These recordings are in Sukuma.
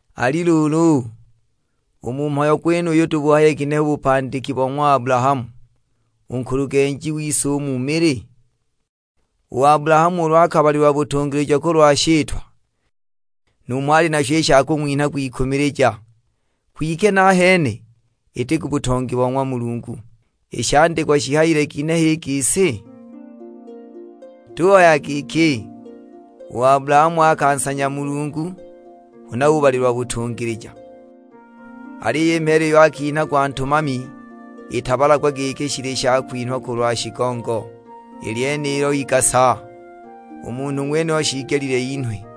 Ali luulu, u mu mhayo gwenuyu tubuhaye kinehe u bupandiki bo ng'wa Abulahamu, u nkulugenji wise u mu mili? U Abulahamu ulu akabalilwa butungilija kulwa shitwa, numho ali nasho i sha kung'winha kwikumilija, kwike nahene iti ku butongi bo ng'wa Mulungu! I shandikwa shihayile ginehe i gisi? Tuhaya giki, "U Abulahamu akansanya Mulungu, huna ubalilwa butungilija!" Aliyo i mheela iyo akinhagwa ntumami itabalagwa giki shili shakwinhwa kulwa shigongo, i lyenilo igasa; u munhu ng'wenuyo shiigelile inhwe.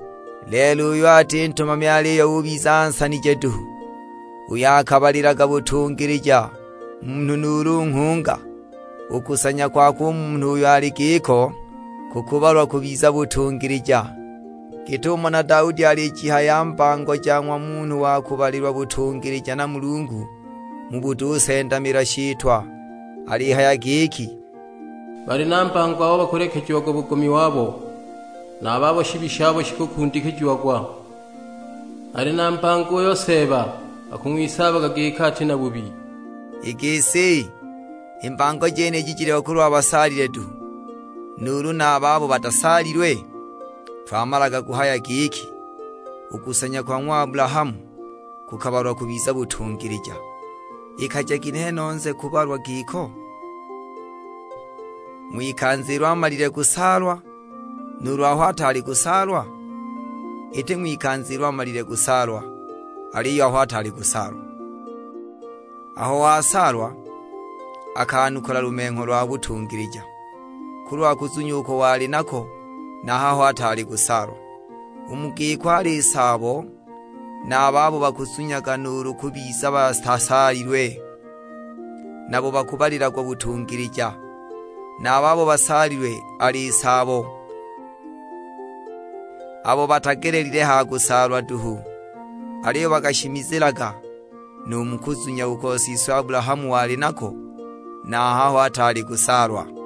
Lelo uyo ati ntumami aliyo ubiza ansanije duhu uyo akabalilaga butungilija munhu nuulu nghunga, u kusanya kwakwe u munhu uyo ali giko, kukubalwa kubiza butungilija. Git'umo na Daudi alijihaya mbango ja ng'wa munhu wa kubalilwa butungilija na Mulungu mu butusendamila shitwa; alihaya giki, "Bali na mbango abo bakulekejiagwa bugomi wabo, na a babo shibi shabo shikukundikijiagwa. Ali na mbango uyo Seeba akung'wisaaba giki ati na bubi." I gisi, i mbango jeniji jiliho kulwa basaalilwe duhu, nuulu na a babo batasaalilwe? Twamalaga kuhaya giki, "U kusanya kwa ng'wa Abulahamu kukabalwa kubiza butungilija." Ikaja ginehe nose kuubalwa giko? Ng'wikanza ilo amalile kusaalwa, nuulu aho ataali kusaalwa? Iti ng'wikanza ilo amalile kusaalwa, aliyo aho ataali kusaalwa. Aho wasaalwa akanukula lumengho lwa butungilija, kulwa kuzunya uko wali nako na a haho ataali kusaalwa. U mu giko ali saabo na a babo bakuzunyaga nuulu bubiza batasaalilwe; nabo bakubalilagwa butungilija. Na a babo basaalilwe ali saabo, abo batagelelile ha kusaalwa duhu; aliyo bakashimizilaga nu mu kuzunya uko siswe Abulahamu wali nako na a haho ataali kusaalwa.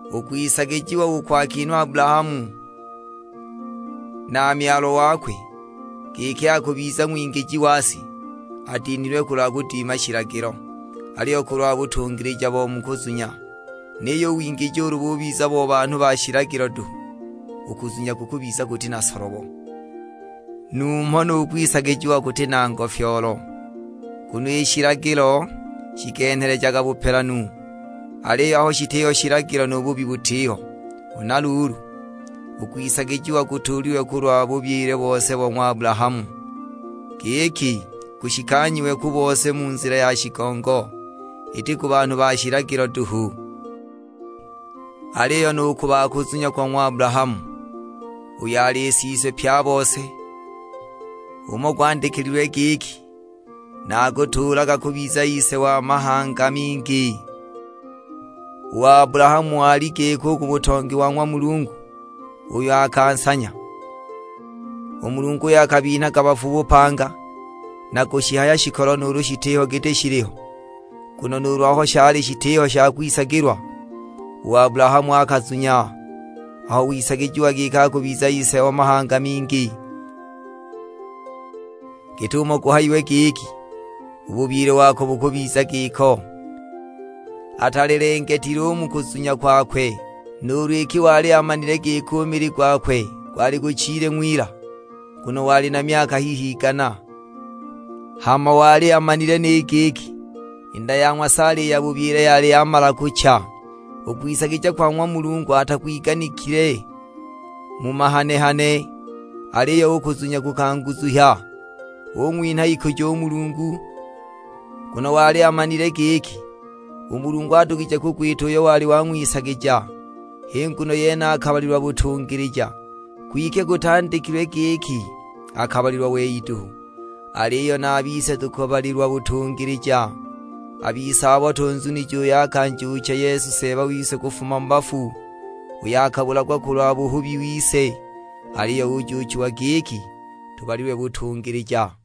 U kwisagijiwa uko akinhwa Abulahamu na Myalwa wakwe, giki akubiza ng'wingiji wa si, atinhilwe kulwa kudima shilagilo, aliyo kulwa butungilija bo mu kuzunya. Niyo u wingiji ulu bubiza bo banhu ba shilagilo duhu, u kuzunya kukubiza kuti na solobo, numho nu kwisagijiwa kuti na ngofyoolo. Nguno i shilagilo shikenhelejaga bupelanu, aliyo aho shitiho shilagilo nu buhubi butiho. Huna luulu, u kwisagijiwa kutuulilwe kulwa bubyile bose wa ng'wa Abulahamu, giki kushikanyiwe ku bose mu nzila ya shigongo; iti ku banhu ba shilagilo duhu. Aliyo nu ku ba kuzunya kwa ng'wa Abulahamu, uyo ali siswe pye a bose. H'umo gwandikililwe; giki, "Naakutuulaga kubiza ise wa mahanga mingi". U Abulahamu ali giko u ku butongi bo ng'wa Mulungu uyo akansanya, u Mulungu uyo akabinhaga bafu bupanga, na kushihaya shikolo nuulu shitiho giti shiliho. Nguno nuulu aho shali shitiho sha kwisagilwa, u Abulahamu akazunya aho wisagijiwa giki akubiza ise o mahanga mingi; git'umo guhayiwe giki, "U bubyile wako bukubiza giko." Atalelengetile u mu kuzunya kwakwe, nuulu iki wali amanile giki u mili gwakwe gwali guchile ng'wila, nguno wali na myaka hihi igana; hama wali amanile ni giki i nda ya ng'wa Saala i ya bubyile yali yamala kucha. U kwisagija kwa ng'wa Mulungu atakwiganikile mu mahane-hane, aliyo u kuzunya kukanguzunhya, ung'winha ikujo u Mulungu. Nguno wali amanile giki, u Mulungu adugije kugwita uyo wali wang'wisagija; h'i nguno yene akabalilwa butungilija. Kwike gutandikilwe giki akabalilwa wei duhu. Aliyo na a bise tukubalilwa butungilija, a bise abo tunzunije uyo akanjuucha Yesu Seeba wise kufuma mu bafu; uyo akabulagwa kulwa buhubi wise, aliyo ujuuchiwa giki tubalilwe butungilija.